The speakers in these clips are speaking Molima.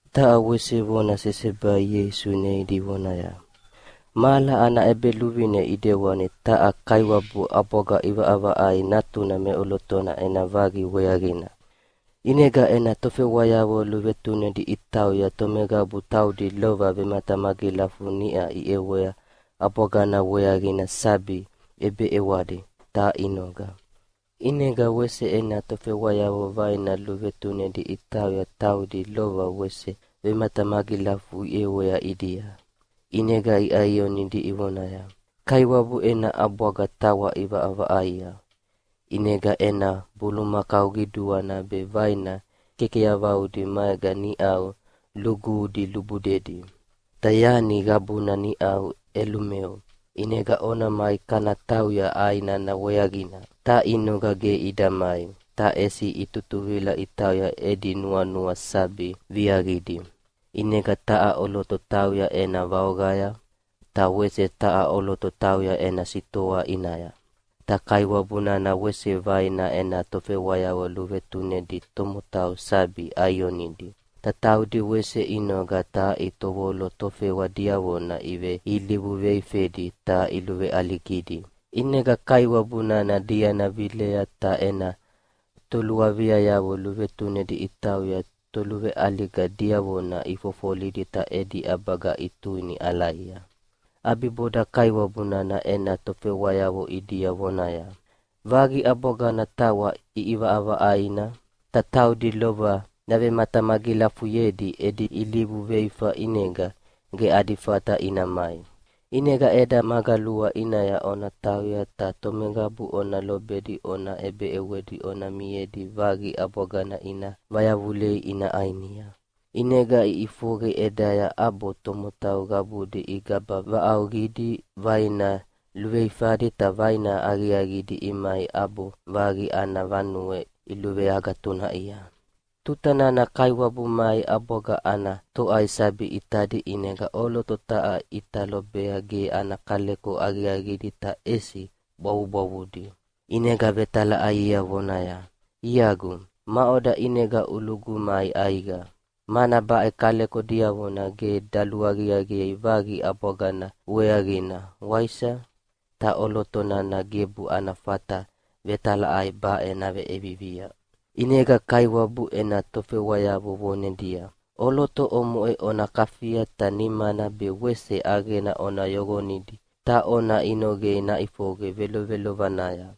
Taha wese vona sesebai Ieisu neidi vonaya, “Mahala ana ʼEbeluvine ʼidewani taha kaiwabu ʼabwaga ʼivaʼavaʼaia natuna meʼolotona ena vaqi weaqina. ʼInega ena tofewayavo luvetunedi itauya tomeqabu taudi lova vematamagilafu niʼa iʼewea ʼabwagana weaqina sabi ʼebeʼewadi, ta inoga. “ʼInega wese ena tofewayavo vaina luvetunedi itauya taudi lova wese vematamagilafu iʼewea ʼidia. ʼInega iʼaionidi ivonaya, ‘Kaiwabu ena ʼabwaga tawa ʼivaʼavaʼaia, ʼinega ena bulumakau qiduana be vaina kekeyauvaudi maega niʼau luguhudi lubudedi. Ta yani qabuna niʼau ʼelumeo, ʼinega ona mai kana tauya ʼai nana weaqina.’ Ta inoga ge ida mai, ta ʼesi itutuvila itauya edi nuanua sabi viaqidi. ʼInega taha ʼoloto tauya ena vaoqaya, ta wese taha ʼoloto tauya ena sitoa ʼinaya. “Ta kaiwabu nana wese vaina ena tofewayavo luvetunedi tomotau sabi ʼaionidi, ta taudi wese inoga ta itovolo tofewa diavona iveilivu veifedi ta iluveʼaligidi. ʼInega kaiwabu nana diana vilea ta ena toluaviayavo luvetunedi itauya toluveʼaliga diavona ifofolidi ta edi ʼabaga ituini ʼalaia. “ʼAbiboda kaiwabu nana ena tofewayavo ʼidia vonaya, ‘Vaqi ʼabwagana tawa ʼiʼivaʼavaʼaina, ta taudi lova yavematamagilafuyedi edi ilivu veifana ʼinega ge adi fata ina mai. ʼInega ʼeda magalua ʼinaya ona tauya ta tomeqabu ona lobedi ona ʼebeʼewedi ona miedi vaqi ʼabwagana ina vayavulei ina ʼainia.’ ʼInega iʼifoqe ʼedaya ʼabo tomotau qabudi igaba vaʼauʼauqidi vaina luveifadi ta vaina aqiaqidi imai ʼabo vaqi ana vanue iluveagatunaʼia. “Tuta nana kaiwabu mai ʼabwaga ana toʼai sabi ʼitadi ʼinega ʼoloto taha ʼita lobea ge ana kaleko aqiaqidi ta ʼesi bwavubwavudi. ʼInega vetalaʼaiea vonaya, ‘Iagu, maʼoda ʼinega ulugu mai ʼaiqa, mana baʼe kaleko diavona ge daluaqiaqiei vaqi ʼabwagana weaqina, waisa?’ Ta ʼoloto nana gebu ana fata vetalaʼai baʼe naveʼevivia. “ʼInega kaiwabu ena tofewayavo vonedia, ‘ʼOloto omoʼe ona kafia ta nimana be wese ʼaqena ona yoqonidi ta ona inoqei naʼifoqe velovelovanaya,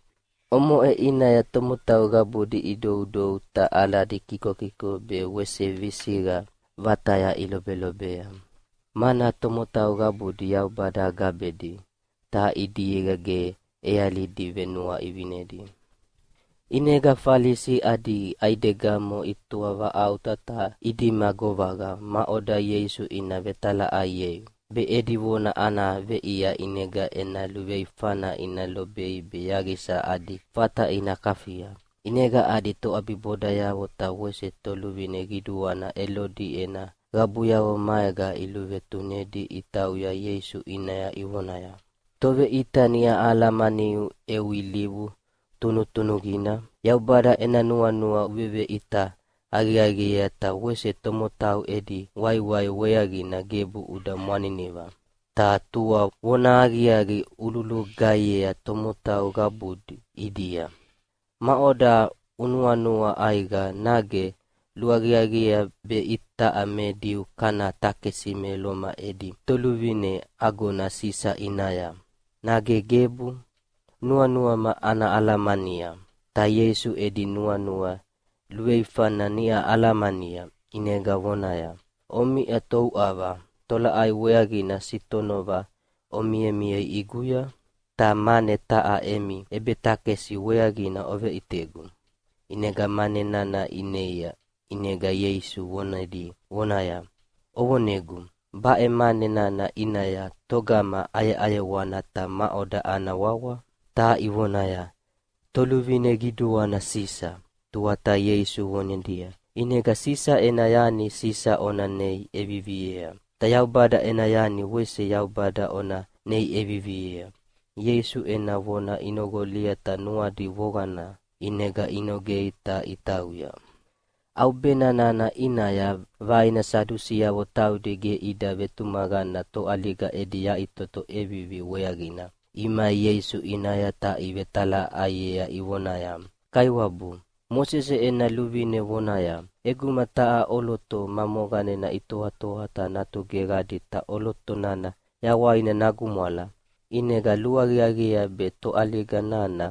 omoʼe ʼinaya tomotau qabudi idoudou ta aladi kikokiko be wese visiqa vataya ilobelobea.’ Mana tomotau qabudi Yaubada gabedi, ta ʼidiega ge ʼealidi venuaʼivinedi.” ʼInega Falisi adi ʼaidegamo itoavaʼauta ta idima govaqa maʼoda Ieisu ina vetalaʼaiei, be edi vona ana veʼia ʼinega ena luveifana ina lobei be yaqisa adi fata ina kafia. ʼInega adi toʼabibodayavo ta wese toluvine qiduana Elodi ena qabuyavo maega iluvetunedi itauya Ieisu ʼinaya ivonaya, “Toveʼita niʼa ahalamaniu eu ilivu tunutunuqina, Yaubada ena nuanua uveveʼita aqiaqiea ta wese tomotau edi waiwai weaqina gebu uda mwaniniva, ta tua vonahaqiaqi ululugaihiea tomotau qabudi ʼidia. Maʼoda unuanua ʼaiqa, nage luaqiaqiea be itaʼa me Diu kana takesi me Loma edi toluvine agona Sisa ʼinaya, nage gebu? Nuanuama ana alamania.” Ta Ieisu edi nuanua luveifana niʼa alamania, ʼinega vonaya, “Omiʼa touʼava. Tolaʼai weaqina sitonova omimiei ʼiguya? Ta mane taha emi ʼebetakesi weaqina oveʼitegu.” ʼInega mane nana ineia. ʼInega Ieisu vonedi vonaya, “Ovonegu, baʼe mane nana ʼinaya, togama ʼayeʼayewana ta maʼoda ana wawa?” Ta ivonaya, “Toluvine qiduana Sisa.” Tuata Ieisu vonedia, “ʼInega Sisa ena yani Sisa ona nei ʼeviviea, ta Yaubada ena yani wese Yaubada ona nei ʼeviviea.” Ieisu ena vona inoqolia ta nuadi voqana, ʼinega inogei ta itauya. ʼAubena nana ʼinaya vaina Sadusiavo taudi ge ida vetumaqana toʼaliga edi yaʼitoto ʼevivi weaqina, imai Ieisu ʼinaya ta ivetalaʼaiea ivonaya, “Kaiwabu, Mosese ena luvine vonaya, ‘ʼEguma taha ʼoloto ma moqanena itoatoa ta natu geqadi ta ʼoloto nana yawaina nagumwala, ʼinega luaqiaqiea be toʼaliga nana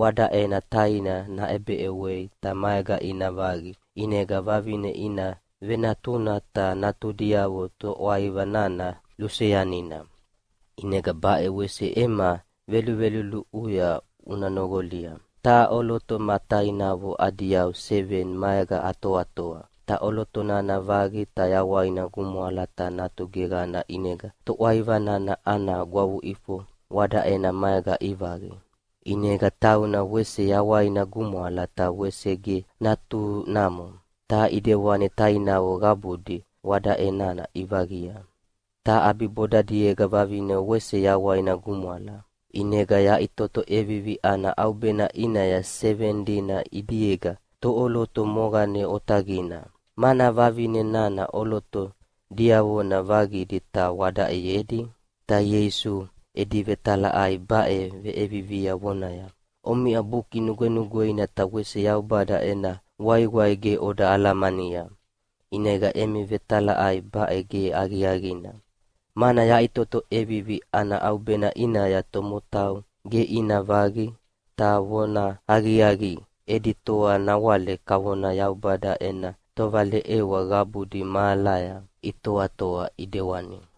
wadaʼena taina naʼebeʼewei ta maega ina vaqi, ʼinega vavine ina venatuna ta natudiavo toʼwaiva nana luseanina.’ “ʼInega baʼe wese ema veluluʼuya una noqolia. Taha ʼoloto ma tainavo adi yau seveni maega atoatoa, ta ʼoloto nana vaqi ta yawaina gumwala ta natu geqana ʼinega toʼwaiva nana ana gwavuʼifo wadaʼena maega ivaqi. ʼInega tauna wese yawaina gumwala ta wese ge natunamo, ta ʼidewani tainavo qabudi wadaʼe nana ivaqia. Ta ʼabibodadiega vavine wese yawaina gumwala. ʼInega yaʼitoto ʼevivi ana ʼaubena ʼinaya seveni dina ʼidiega toʼoloto moqane otaqina, mana vavine nana ʼoloto diavona vaqidi ta wadaʼeyedi?” Ta Ieisu edi vetalaʼai baʼe veʼevivia vonaya, “Omiʼa Buki Nugwenugweina ta wese Yaubada ena waiwai ge oda alamania, ʼinega emi vetalaʼai baʼe ge aqiaqina. Mana yaʼitoto ʼevivi ana ʼaubena ʼinaya tomotau ge ina vaqi, ta vonahaqiaqi, edi toa nawale kavona Yaubada ena tovaleʼewa qabudi mahalaya itoatoa ʼidewani.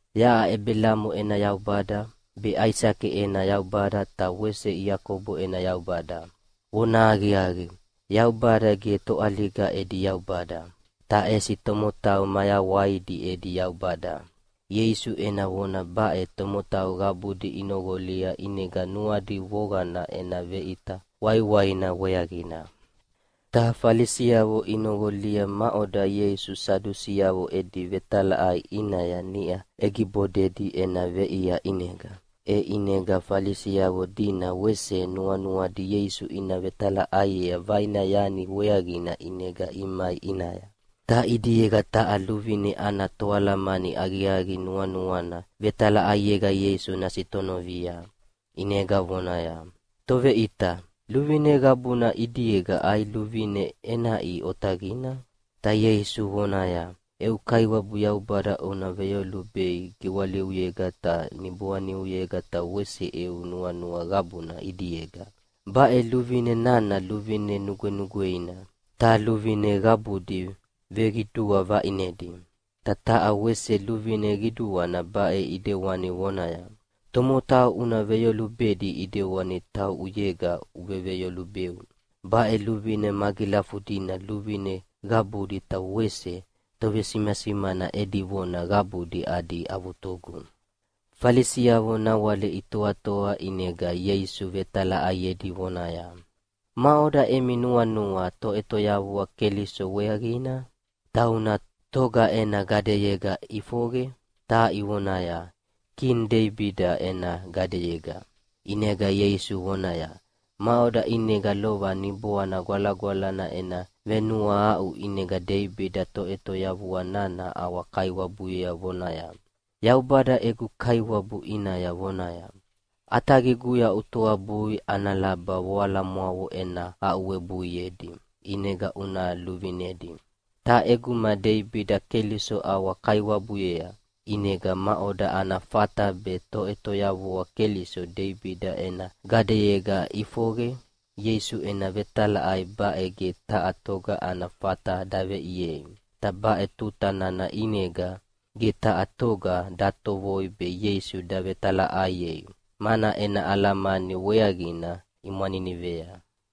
‘Yaʼa Ebelamo ena Yaubada, be Aisake ena Yaubada ta wese Iakobo ena Yaubada. Vonahaqiaqi, Yaubada ge toʼaliga edi Yaubada, ta ʼesi tomotau mayawaidi edi Yaubada.’” Ieisu ena vona baʼe tomotau qabudi inoqolia ʼinega nuadi voqana ena veʼita waiwaina weaqina. Ta Falisiavo inoqolia maʼoda Ieisu Sadusiavo edi vetalaʼai ʼinaya niʼa ʼegibodedi ena veʼia ʼinega. E ʼinega Falisiavo dina wese nuanuadi Ieisu ina vetalaʼaiea vaina yani weaqina ʼinega imai ʼinaya. Ta ʼidiega taha luvine ana toalamani aqiaqi nuanuana vetalaʼaiega Ieisu nasitonovia, ʼinega vonaya, “Toveʼita, luvine qabuna ʼidiega ai luvine ʼenaʼi otaqina?” Ta Ieisu vonaya, “Eu Kaiwabu Yaubada una veyolubei giwaliuyega ta niboaniuyega ta wese eu nuanua qabuna ʼidiega. Baʼe luvine nana luvine nugwenugweina, ta luvine qabudi veqidua vaʼinedi. “Ta taha wese luvine qiduana baʼe ʼidewani vonaya, ‘Tomotau una veyolubedi ʼidewani tauʼuyega uveveyolubeu.’ Baʼe luvine magilafudina luvine qabudi ta wese tovesimasimana edi vona qabudi adi avutugu.” Falisiavo nawale itoatoa ʼinega Ieisu vetalaʼaiedi vonaya, “Maʼoda emi nuanua Toʼetoyavua Keliso weaqina? Tauna toga ena gadeyega ʼifoqe?” Ta ivonaya, “Kini Deibida ena gadeyega.” ʼInega Ieisu vonaya, “Maʼoda ʼinega lova Niboana Gwalagwalana ena venuahaʼu ʼinega Deibida Toʼetoyavua nana ʼawa-Kaiwabuyea vonaya, ‘Yaubada egu Kaiwabu ʼinaya vonaya, ʼAtaqiguya utoabui ana laba voalamwavo ena aʼuwebuiedi, ʼinega una luvinedi.’ Ta ʼeguma Deibida Keliso ʼawa-Kaiwabuyea, ʼinega maʼoda ana fata be Toʼetoyavua Keliso Deibida ena gadeyega ʼifoqe?” Ieisu ena vetalaʼai baʼe ge taha toga ana fata daveʼiei. Ta baʼe tuta nana ʼinega ge taha toga datovoi be Ieisu davetalaʼaiei, mana ena alamani weaqina imwaninivea.